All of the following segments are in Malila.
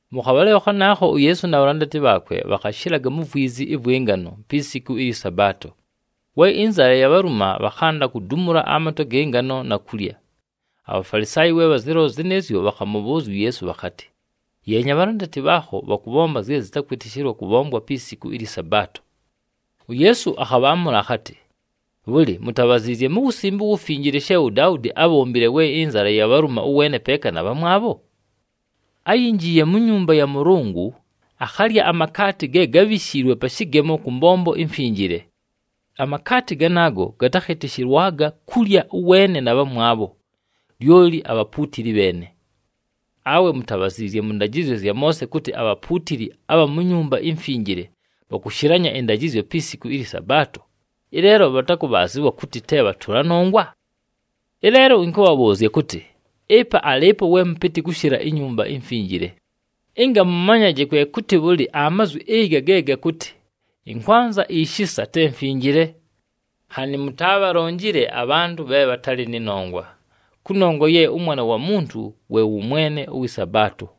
Mʉ khabhalɨlo khanaakho, uYeesu na bhalandati bhaakwe bhakhashɨlaga mu vwizi ɨvwɨ ngano pi siku ɨlyɨ Sabaato. We ɨnzala yabhaluma, bhakhanda kudumula amatwe agɨ ngano na kulya. ABhafalisaayi we bhazɨlola zɨnɨɨzyo, bhakhamʉbhʉʉzya uYeesu bhakhatɨ, “Yeenya, abhalandati bhaakho bhakʉbhomba zye zɨtakwɨtɨshɨlwa kʉbhomba pi siku ɨlyɨ Sabaato!” UYeesu akhabhaamʉla akhatɨ, “Bhʉlɨ, mutabhaziizye mu Wusimbe uWufinjile she uDaudi ábhombile we ɨnzala yabhaluma, ʉweene peeka na bhamwabho? Áyinjiiye mu nyumba ya Mʉlʉngʉ, akhalya amakaati ge gábhishiilwe pa shɨgemo kʉ mbombo imfinjile. Amakaati ganaago gatakhɨtɨshɨlwaga kulya ʉweene na bhamwabho, lyoli abhapuutili bheene. Awe mutabhaziizye mʉ ndajɨzyo zya Moose kʉtɨ abhapuutili abha mu Nyumba iMfinjile bhakʉshɨlanya ɨndajɨzyo pi siku ɨlyɨ Sabaato, ɨleelo bhakʉbhaazɨwa kʉtɨ te bhatʉla nongwa? Ɨleelo ɨnkʉbhabhʉʉzya kʉtɨ, ɨpa alɨɨpo we mʉpɨtɨ kʉshɨla iNyumba iMfinjile. Ɨnga mʉmanyaje kwe kʉtɨ bhʉlɨ amazwi ɨga ge gakʉtɨ, ‘Ɨnkwanza ishisa te mfinjile,’ nhanɨ mutaabhalonjile abhantʉ bhe bhatalɨ nɨ nongwa. Kʉnongwa ye ʉMwana wa Muntu we wʉ Mwene ʉwɨ Sabaato.”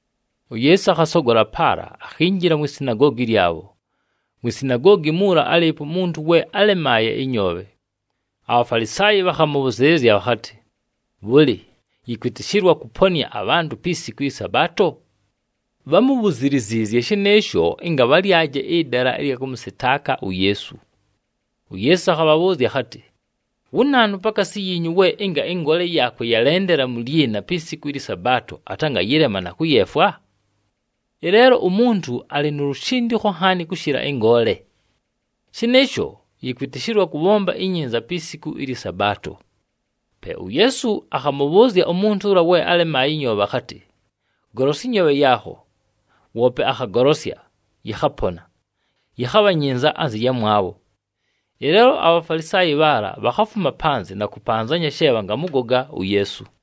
UYeesu akhasogola paala, akhinjila mwi sinagoogi lyabho. Mwi sinagoogi muula, álɨɨpo umuntu we álemaaye ɨnyoobhe. ABhafalisaayi bhakhamʉbhʉzɨɨlɨzya bhakhatɨ, “Bhʉlɨ, yɨkwɨtɨshɨlwa kʉponɨa abhantʉ pi siku ɨlyɨ Sabaato?” Bhámubhuziliziizye shɨnɨɨsho ɨnga bhalyaje ɨdala ɨlya kʉmʉsɨtaaka uYeesu. UYeesu akhabhabhʉʉzya akhatɨ, “Wu naanu pakaasi yiinyu we ɨnga ɨngoole yaakwe yalendela mu lyina pi siku ɨlyɨ Sabaato atangayɨlema na kʉyeefwa? Ɨleelo umuntu alɨ nu lushindikho nhaani kʉshɨla ɨngoole! Shɨnɨɨsho, yɨkwɨtɨshɨlwa kʉbhomba inyinza pi siku ɨlyɨ Sabaato.” Pe uYeesu akhamʉbhʉʉzya umuntu ʉla we álemaaye ɨnyoobhe akhatɨ, “Golosya ɨnyoobhe yaakho.” Woope akhagolosya, yɨkhapona, yɨkhabha nyinza anzɨ yamwabho. Ɨleelo aBhafalisaayi bhaala bhakhafuma panzɨ na kʉpanzanya she bhangamʉgoga uYeesu.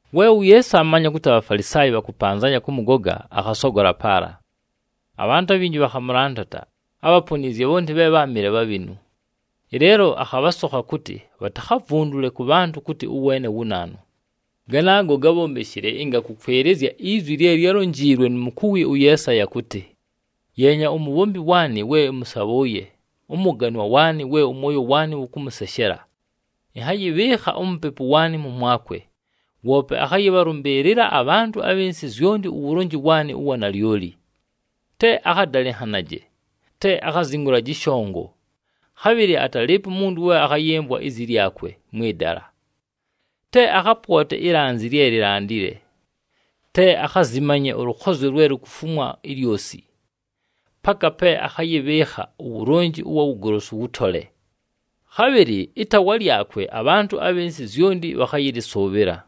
We uYeesu aamanya kʉtɨ aBhafalisaayi bhakʉpanzanya kʉmʉgoga, akhasogola paala. Abhantʉ abhinji bhakhamʉlandata, ábhaponiizye bhonti bhe bháamɨle bhabhinu. Ɨleelo akhabhasokha kʉtɨ bhatakhavundule kʉ bhantʉ kʉtɨ ʉweene wu naanu. Ganaago gábhombeshile ɨnga kʉkwɨlɨzya izwi lye lyálonjiilwe nu mukuwi ʉYeesaya kʉtɨ, “Yeenya, umubhombi waanɨ we ɨmʉsabhʉʉye, ʉMʉganwa waanɨ we ʉmwoyo waanɨ wʉkʉmʉseshela. Ɨnhayɨbhɨɨkha uMupepu waanɨ mʉmwakwe, woope akhayɨbhalʉmbɨɨlɨla abhantʉ abhɨ nsɨ zyonti uwulonji waanɨ ʉwa nalyoli. Te akhadalɨnhanaje, te akhazingulaje ɨshongo, khabhɨlɨ atalɨɨpo umuntu we akhayɨmvwa izi lyakwe mwɨ dala. Te akhapwote ilanzi lye lilandile, te akhazimanye ʉlʉkhozyo lwe lukufumwa ilyosi, paka pe akhayɨbhɨɨkha uwulonji ʉwa wugolosu wʉtole. Khabhɨlɨ ɨtaawa lyakwe abhantʉ abhɨ nsɨ zyonti bhakhayɨlɨsʉʉbhɨla.”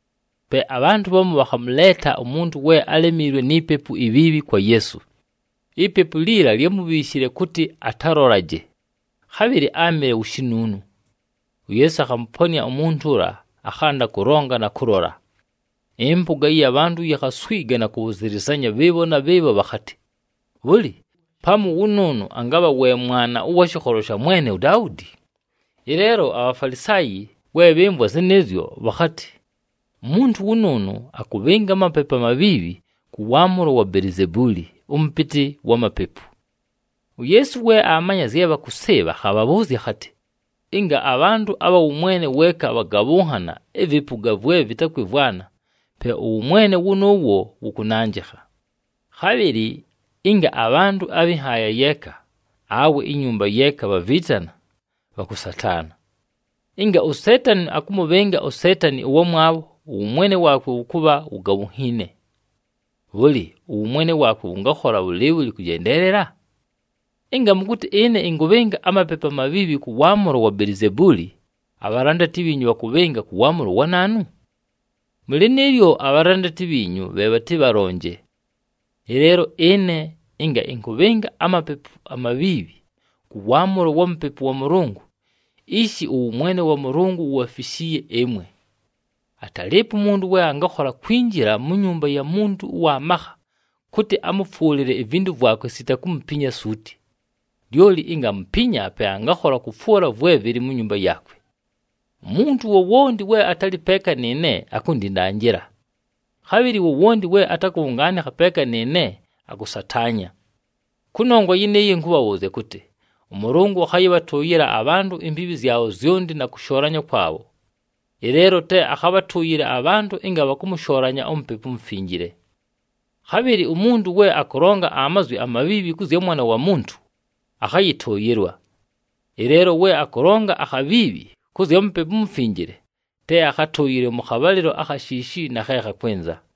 Pe abhantʉ bhamu bhakhamʉleeta umuntu we álemiilwe ni pepu ibhiibhi kwa Yeesu. Ipepu liila lyámubhiishile kʉtɨ atalolaje, khabhɨlɨ áamɨle wu shinuunu. UYeesu akhamʉponɨa umuntu ʉla, akhanda kʉlonga na kʉlola. Ɨmpʉga ɨya bhantʉ yikhaswiga na kʉbhʉzɨlɨzanya bhɨɨbho na bhɨɨbho bhakhatɨ, “Bhʉlɨ, pamu wʉnʉʉnʉ angabha we Mwana ʉwa shɨkholo sha mwene uDaudi?” Ɨleelo aBhafalisaayi we bhɨmvwa zɨnɨɨzyo, bhakhatɨ, “Umuntu wʉnʉʉnʉ akʉbhɨnga amapepu amabhiibhi kʉ waamʉlo wa Belizebuuli, ʉmʉpɨtɨ wa mapepu!” UYeesu we aamanya zye bhakʉsɨɨbha, akhabhabhʉʉzya akhatɨ, “Ɨnga abhantʉ abha wʉmwene weeka bhagabhʉnhana ɨvɨpʉga vwe vɨtakwɨmvwana, pe ʉwʉmwene wʉnʉʉwo wʉkʉnanjɨkha. Khabhɨlɨ ɨnga abhantʉ abhɨ nhaaya yeeka awe inyumba yeeka bhaviitana, bhakʉsataana. Ɨnga uSeetani akʉmʉbhɨnga uSeetani ʉwamwabho, ʉwʉmwene waakwe wʉkʉbha wugabhunhiine. Bhʉlɨ, ʉwʉmwene waakwe wʉngakhola bhʉlɨɨbhʉlɨ kʉjendeelela? Ɨnga mʉkʉtɨ ɨne ɨnkʉbhɨnga amapepu amabhiibhi kʉ waamʉlo wa Belizebuuli, abhalandati bhiinyu bhakʉbhɨnga kʉ waamʉlo wa naanu? Mʉ lɨnɨɨlyo, abhalandati bhiinyu bhe bhatɨbhalonje. Ɨleelo ɨne, ɨnga ɨnkʉbhɨnga amapepu amabhiibhi kʉ waamʉlo wa Mupepu wa Mʉlʉngʉ, ishi ʉwʉmwene wa Mʉlʉngʉ wubhafishiiye ɨmwe! Atalɨɨpo umuntu we angakhola kwinjila mu nyumba ya muntu ʉwa makha kʉtɨ amʉfwʉlɨle ivintu vwakwe sita kumupinya suuti. Lyoli ɨnga amupinya, pe angakhola kʉfwʉla vwe vɨlɨ mu nyumba yaakwe. “Umuntu wowonti we atalɨ peeka nɨɨne, akundindanjila. Khabhɨlɨ wowonti we atakʉbhʉngaanɨkha peeka nɨɨne, akʉsataanya. Kʉnongwa yɨnɨɨyo, ɨnkʉbhabhʉʉzya kʉtɨ, ʉMʉlʉngʉ akhayɨbhatʉʉyɨla abhantʉ imbiibhi zyabho zyonti na kʉshoolanya kwabho, ɨleelo te akhabhatʉʉyɨle abhantʉ ɨnga bhakʉmʉshoolanya uMupepu uMufinjile. Khabhɨlɨ umuntu we akʉlonga amazwi amabhiibhi kʉ zya Mwana wa Muntu, akhayɨtʉʉyɨlwa. Ɨleelo we akʉlonga akhabhiibhi kʉ zya Mupepu uMufinjile te akhatʉʉyɨlwe mʉ khabhalɨlo akha shiishi na khe khakwɨnza.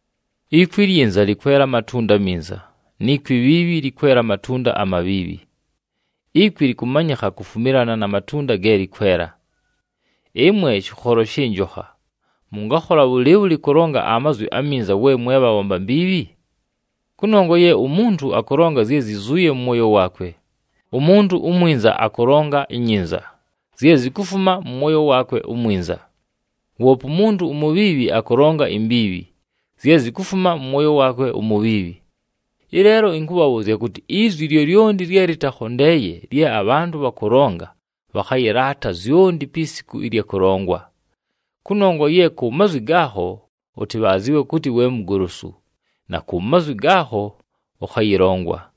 “Ikwi ilyinza lɨkwela amatunda aminza, ni kwi ibhiibhi lɨkwela amatunda amabhiibhi. Ikwi lɨkʉmanyɨkha kufumilana na matunda ge lɨkwela. Ɨmwe shɨkholo shɨ njokha! Mʉngakhola bhʉlɨɨbhʉlɨ kʉlonga amazwi aminza we mwe bhabhomba mbiibhi? Kʉnongwa ye umuntu akʉlonga zye zyizuuye mʉ mwoyo waakwe. Umuntu umwinza akʉlonga inyinza, zye zikufuma mʉ mwoyo waakwe umwinza. Woope umuntu umubhiibhi akʉlonga imbiibhi, zye zikufuma mʉ mwoyo waakwe umubhiibhi. Ɨleelo ɨnkʉbhabhʉʉzya kʉtɨ, izwi lyolyonti lye lɨtakhondeeye lye abhantʉ bhakʉlonga bhakhayɨlaata zyonti pi siku ɨlya kʉlongwa. Kʉnongwa ye ku mazwi gaakho ʉtɨbhaazɨwe kʉtɨ we mugolosu, na ku mazwi gaakho ʉkhayɨlongwa.”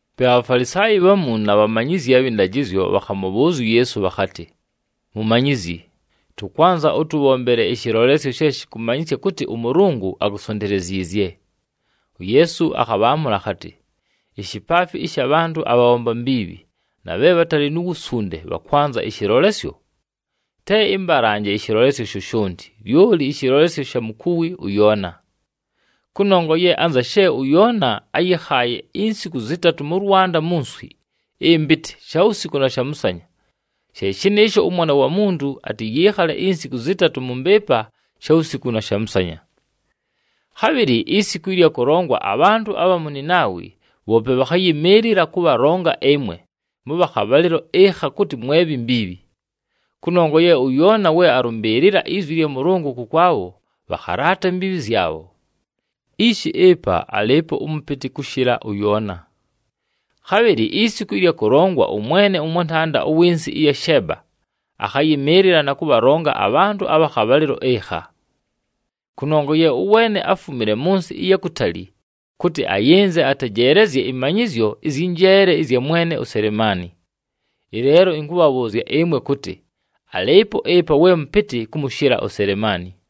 Pe aBhafalisaayi bhamu na bhamanyizyi abhɨ ndajɨzyo bhakhamʉbhʉʉzya uYeesu bhakhatɨ, “Mumanyizyi, tʉkwanza ʉtʉbhombele ɨshɨlolesyo she shɨkʉmanyɨsya kʉtɨ ʉMʉlʉngʉ akusonteleziizye.” UYeesu akhabhaamʉla akhatɨ, “Ishipaafi ɨsha bhantʉ abhabhomba mbiibhi na bhe bhatalɨ nu wusunde bhakwanza ɨshɨlolesyo! Te ɨmbalanje ɨshɨlolesyo shoshonti, lyoli ɨshɨlolesyo sha mukuwi ʉYoona. Kʉnongwa ye anza she ʉYoona áyɨkhaaye insiku zɨtatʉ mʉ lwanda mu nswi ɨmpɨtɨ shawusiku na shamʉsanya, she shɨnɨɨsho ʉMwana wa Muntu atɨyɨɨkhale insiku zɨtatʉ mʉ mbɨɨpa shawusiku na shamʉsanya. Khabhɨlɨ isiku ɨlya kʉlongwa, abhantʉ abha mu Ninaawi bhoope bhakhayɨmɨɨlɨla kʉbhalonga ɨmwe mʉbha khabhalɨlo ɨkha kʉtɨ mwe bhi mbiibhi. Kʉnongwa ye ʉYoona we alʉmbɨɨlɨla izwi lya Mʉlʉngʉ kʉkwabho, bhakhalaata imbiibhi zyabho. Ishi ɨpa alɨɨpo ʉmʉpɨtɨ kʉshɨla ʉYoona. Khabhɨlɨ isiku ɨlya kʉlongwa ʉmwene ʉmwantanda ʉwɨ nsɨ ɨya Sheeba, akhayɨmɨɨlɨla na kʉbhalonga abhantʉ abha khabhalɨlo ɨkha. Kʉnongwa ye ʉweene áfumile mʉ nsɨ ɨya kutali kʉtɨ ayɨnze atejeelezye ɨmanyɨzyo ɨzyɨ njeele ɨzya mwene uSelemaani. Ɨleelo ɨnkʉbhabhʉʉzya ɨmwe kʉtɨ alɨɨpo ɨpa we mʉpɨtɨ kʉmʉshɨla uSelemaani.”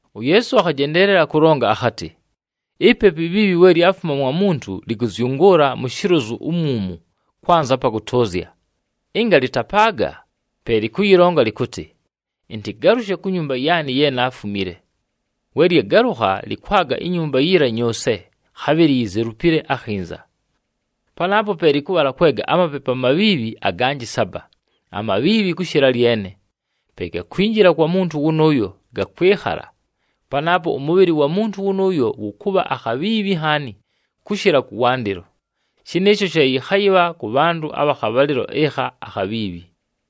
UYeesu akhajendeelela kʉlonga akhatɨ, “Ipepu ibhiibhi we lyafuma mwa muntu, lɨkʉzyʉngʉʉla mu shilozu umwumu kwanza apa kʉtʉʉzya. Ɨnga lɨtapaaga, pe lɨkʉyɨlonga lɨkʉtɨ, ‘Ɨntɨgalʉshe ku nyumba yaanɨ ye naafumile.’ We lyagalʉkha, lɨkwaga inyumba yiila nyʉʉse, khabhɨlɨ yizelupile akhinza. Panaapo pe lɨkʉbhala kwega amapepu amabhiibhi aganjɨ saba, amabhiibhi kʉshɨla lyene. Pe gakwinjila kwa muntu wʉnʉʉyo, gakwɨkhala. Panaapo ʉmʉbhɨlɨ wa muntu wʉnʉʉyo wʉkʉbha akhabhiibhi nhaani, kʉshɨla kʉwandɨlo. Shɨnɨɨsho she yɨkhayɨbha kʉ bhantʉ abha khabhalɨlo ɨkha akhabhiibhi.”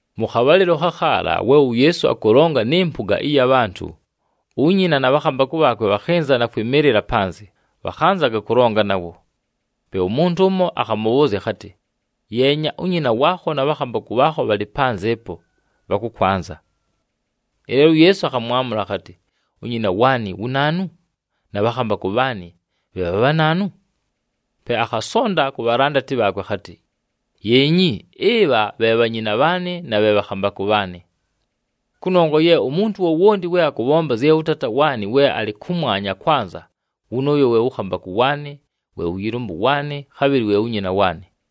Mʉ khabhalɨlo khakhaala we uYeesu akʉlonga nɨ mpʉga ɨya bhantʉ, unyina na bhakhambakʉ bhaakwe bhakhɨnza na kwɨmɨɨlɨla panzɨ, bhakhanzaga kʉlonga nawo. Pe umuntu ʉmo akhamʉbhʉʉzya akhatɨ, “Yeenya, unyina waakho na bhakhambakʉ bhaakho bhalɨ panzɨ ɨpo, bhakʉkwanza.” Ɨleelo uYeesu akhamwamʉla akhatɨ, “Unyina waanɨ wu naanu? Na bhakhambakʉ bhaanɨ bhe bha bhanaanu?” Pe akhasonda ku bhalandati bhaakwe akhatɨ, “Yeenyi, ɨbha bhe bhanyina bhaanɨ na bhe bhakhambakʉ bhaanɨ! Kʉnongwa ye umuntu wowonti we akʉbhomba zye ʉTaata waanɨ we alɨ kʉmwanya akwanza, wʉnʉʉyo we wʉ khambakʉ waanɨ, wʉ yɨlʉmbʉ waanɨ, khabhɨlɨ we wu nyina waanɨ.”